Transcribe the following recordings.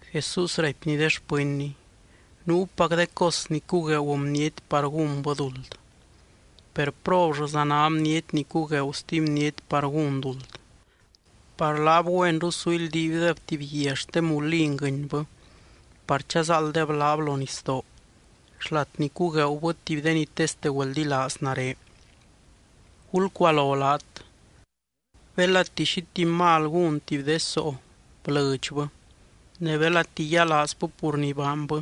Jesús raipny de xpɨnny: —Nuupac de cos ni cugueegu bniety par gúnbɨ duld. Per, ¡probllɨza ná bniety ni cugueegu stuby bniety par gún duld! Par laab güenru su ildiibdeb tuby guia xte mulin guɨnybɨ par chazáalddeb laab lo nisdoo, xlat ni cugueegubɨ tuby de ni teste güeldilaaz nare. Gulcualo laat. ’Belati xi tuby mal gún tuby de soo, blɨdxbɨ, ne belati yialaazbɨ pur ni baanbɨ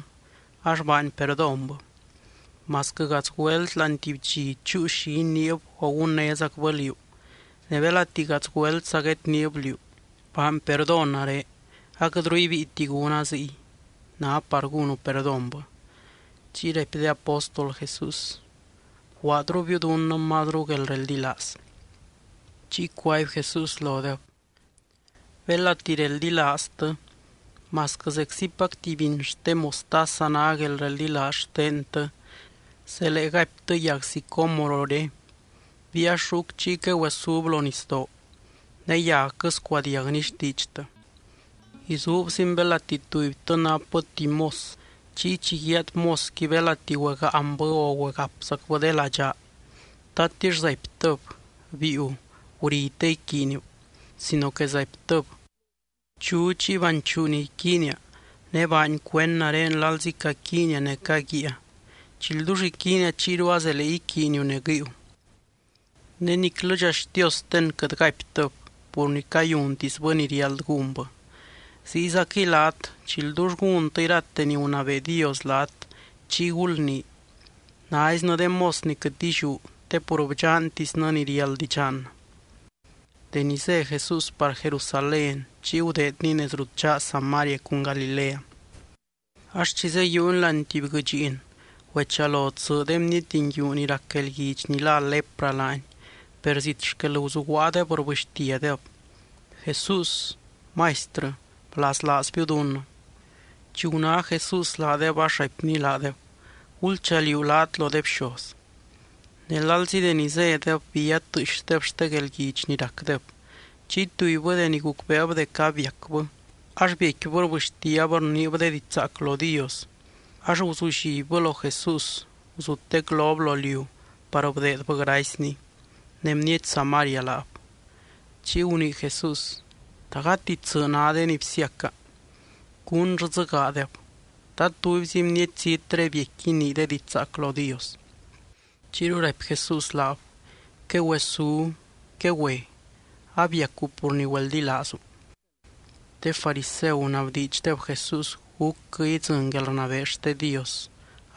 ax baany perdónbɨ. Masquɨ gadz güelt láani tuby dxi chúu xi iniib o gunnézacbɨ liú, ne belati gadz güeltza guedniib liú: “Baany perdón nare, aquɨtru ibíiti gúna ziy”, ná par gúnu perdónbɨ. Chiy raipy de apóstol Jesús: —Bguaadrubiu dunnɨ mazru guelreldilaaz. Chiy cuaby Jesús lodeb: —Belati reldilaaztɨ, masquɨ zeczipac tuby biny xte mostaza ná guelreldilaaz xtentɨ, zelee gaiptɨ yag sicómorore: “Biiax ruc chiy quegüesub lo nisdoo”, ne yagquɨ scuadiagni xtiidxtɨ. ’Izuubzin belati tubytɨ napbɨ tuby mos chiy chi guiaad mosqui belati güegaanbɨ o güegapzacbɨ de ladxaa, ¿tatix zaiptɨb: “Biiu, guri te iquiiniu?”, sino que zaiptɨb: “Bchu chiy banchuu ni iquiinia ne baany cuend nare lalzi caquiinia ne caguíia chi ldull iquiinia chiyru azelee iquiiniu ne guɨiu.” Ne niclɨdxa xtiosten quɨt gaiptɨb pur ni cayuntisbɨ ni riáld gúnbɨ. Ziyzaquɨy laat, chi ldull gúntɨ irate ni gunabee Dios laat, chiy gulnii: “Naiznɨ de mos ni quɨt illiú te pur bdxantisnɨ ni riáld idxannɨ.” Deni zé Jesús par Jerusalén chiy gudeedny nez rut dxaa Samaria cun Galilea. Ax chi zeyiiuny láani tuby guɨdxiin, güechalo tsɨ de bniety nguiu ni rac guelguidx ni lá lepra laany. Per zit xquel guzuguaadeb rbɨxtiadeb: —¡Jesús, Maistrɨ, blaslaazbiu dunnɨ! Chi guná Jesús laadeb ax raipny laadeb: —Gulchaliuu laat lo de bxoz. Ne lalzi deni zédeb, bía tɨɨxdeb xte guelguidx ni racdeb. Chiy tubybɨ deni gucbeeb dec abiacbɨ, ax biecquibɨ rbɨxtiab rniib de diidx zaac lo Dios. Ax guzullibbɨ lo Jesús, guzutec lob lo liu par bdeedbɨ gracyny. Ne bniety Samaria laab. Chiy gunii Jesús: —¿Ta gati tsɨ ná de ni bsiaca? ¿Cúnllɨ dzɨ gaadeb? ¿Ta tubyzi bniety zítre biecqui inii de diidx zaac lo Dios? Chiyru raipy Jesús laab: —Quegüesú. Quegüe. Abiacu pur ni güeldilaazu. De fariseu gunabdiidxdeb Jesús gúcquɨ idzɨny guelrnabee xte Dios,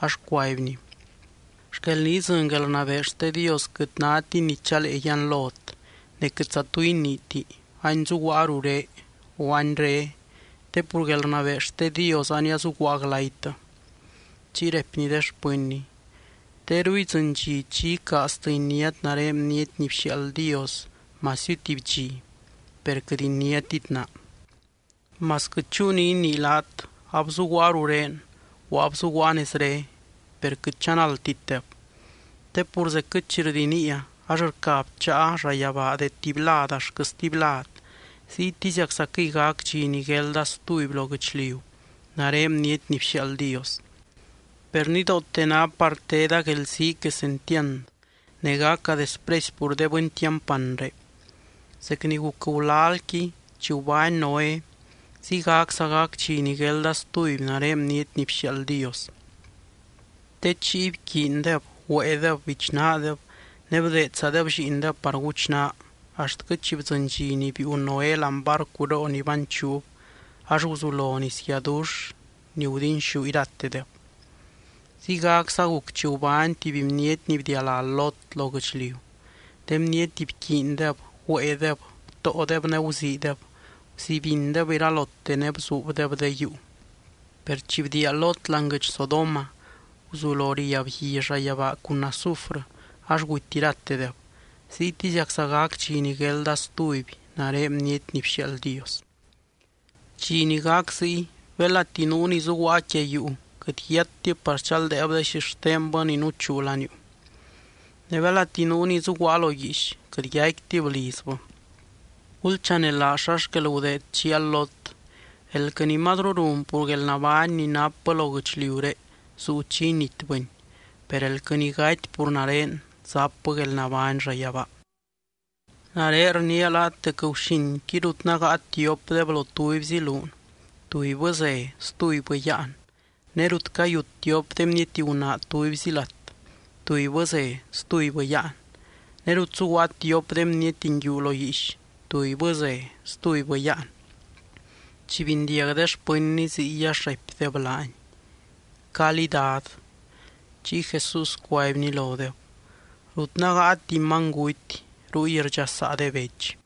ax cuaibny: —Xquel ni idzɨny guelrnabee xte Dios quɨt nátini ni chalee yianlot. Ne quɨtza tu iniiti: “Any zuguaa ruré”, o “Any re”, te pur guelrnabee xte Dios ania zuguaa glaytɨ. Chiy raipny de xpɨnny: —Teru idzɨny dxi chi icaaztɨ iniát nare Bniety ni bxiaald Dios masiu tuby dxi, per quɨt iniátit naa. Masquɨ chúu ni inii laat: “Abzuguaa rurén”, o “Abzuguaa nezre.” Per quɨt chanaldtitdeb. Te pur zecquɨ chi rdiniia ax rca bcháa llayabaa de tuby lad axtquɨ stuby lad, ziytiziaczaquɨy gac dxi ni guelda stuby lo guɨchliu nare Bniety ni bxiaald Dios. Per nidoote ná par teda guelzii quesentiand, ne gaca despresy pur de bɨny tiampanré. Zec ni guc gulalqui chi gubány Noé, ziygacza gac dxi ni guelda stuby nare Bniety ni bxiaald Dios. Te chiy bquiindeb, güéedeb, bichnaadeb, ne bdeedzadeb lliindeb par guchnaa axtquɨ chi bdzɨny dxi ni biiu Noé láani barcuroo ni banchuub ax guzulo nisguiadux ni gudinxú iratedeb. Ziygacza guc chi gubány tuby bniety ni bdialá Lot lo guɨchliu: de bniety bquiindeb, güéedeb, btóodeb ne guziideb, guzibindeb iralote ne bzuubdeb de yuu. Per chi bdiia Lot láani guɨdx Sodoma, guzulo riab gui llayabaa cun azufrɨ, ax guty iratedeb. Ziytiziacza gac dxi ni guelda stuby nare Bniety ni bxiaald Dios. ’Dxi ni gac ziy, belati nuu ni zuguaa quia yuu quɨt yiattib par chaldeeb de xixtenbɨ ni nuchuu laniuu. Ne belati nuu ni zuguaa lo guiix, quɨt yaicquitib lizbɨ. Gulchanelaaz xa xquel gudeed chial Lot. Elquɨ ni mazru run pur guelnabány ni napbɨ lo guɨchliuré zuu chi initbɨni. Per elquɨ ni gaty pur nare, zapbɨ guelnabány llayabaa. ’Nare rniia laat dec guxinqui rut nágaa tiopdeb lo tubyzi luun, tubybɨ ze, stubybɨ yáan. Ne rut cayut tiop de bniety gunaa tubyzi lat, tubybɨ ze, stubybɨ yáan. Ne rut zuguaa tiop de bniety nguiu lo guiix, tubybɨ ze, stubybɨ yáan. Chi bindiag de xpɨnny ziy ax raipdeb laany: —¿Calí, Dad? Chiy Jesús cuaibny lodeb: —Rut nágaa tuby manyguty ruy rdxasaa de bech.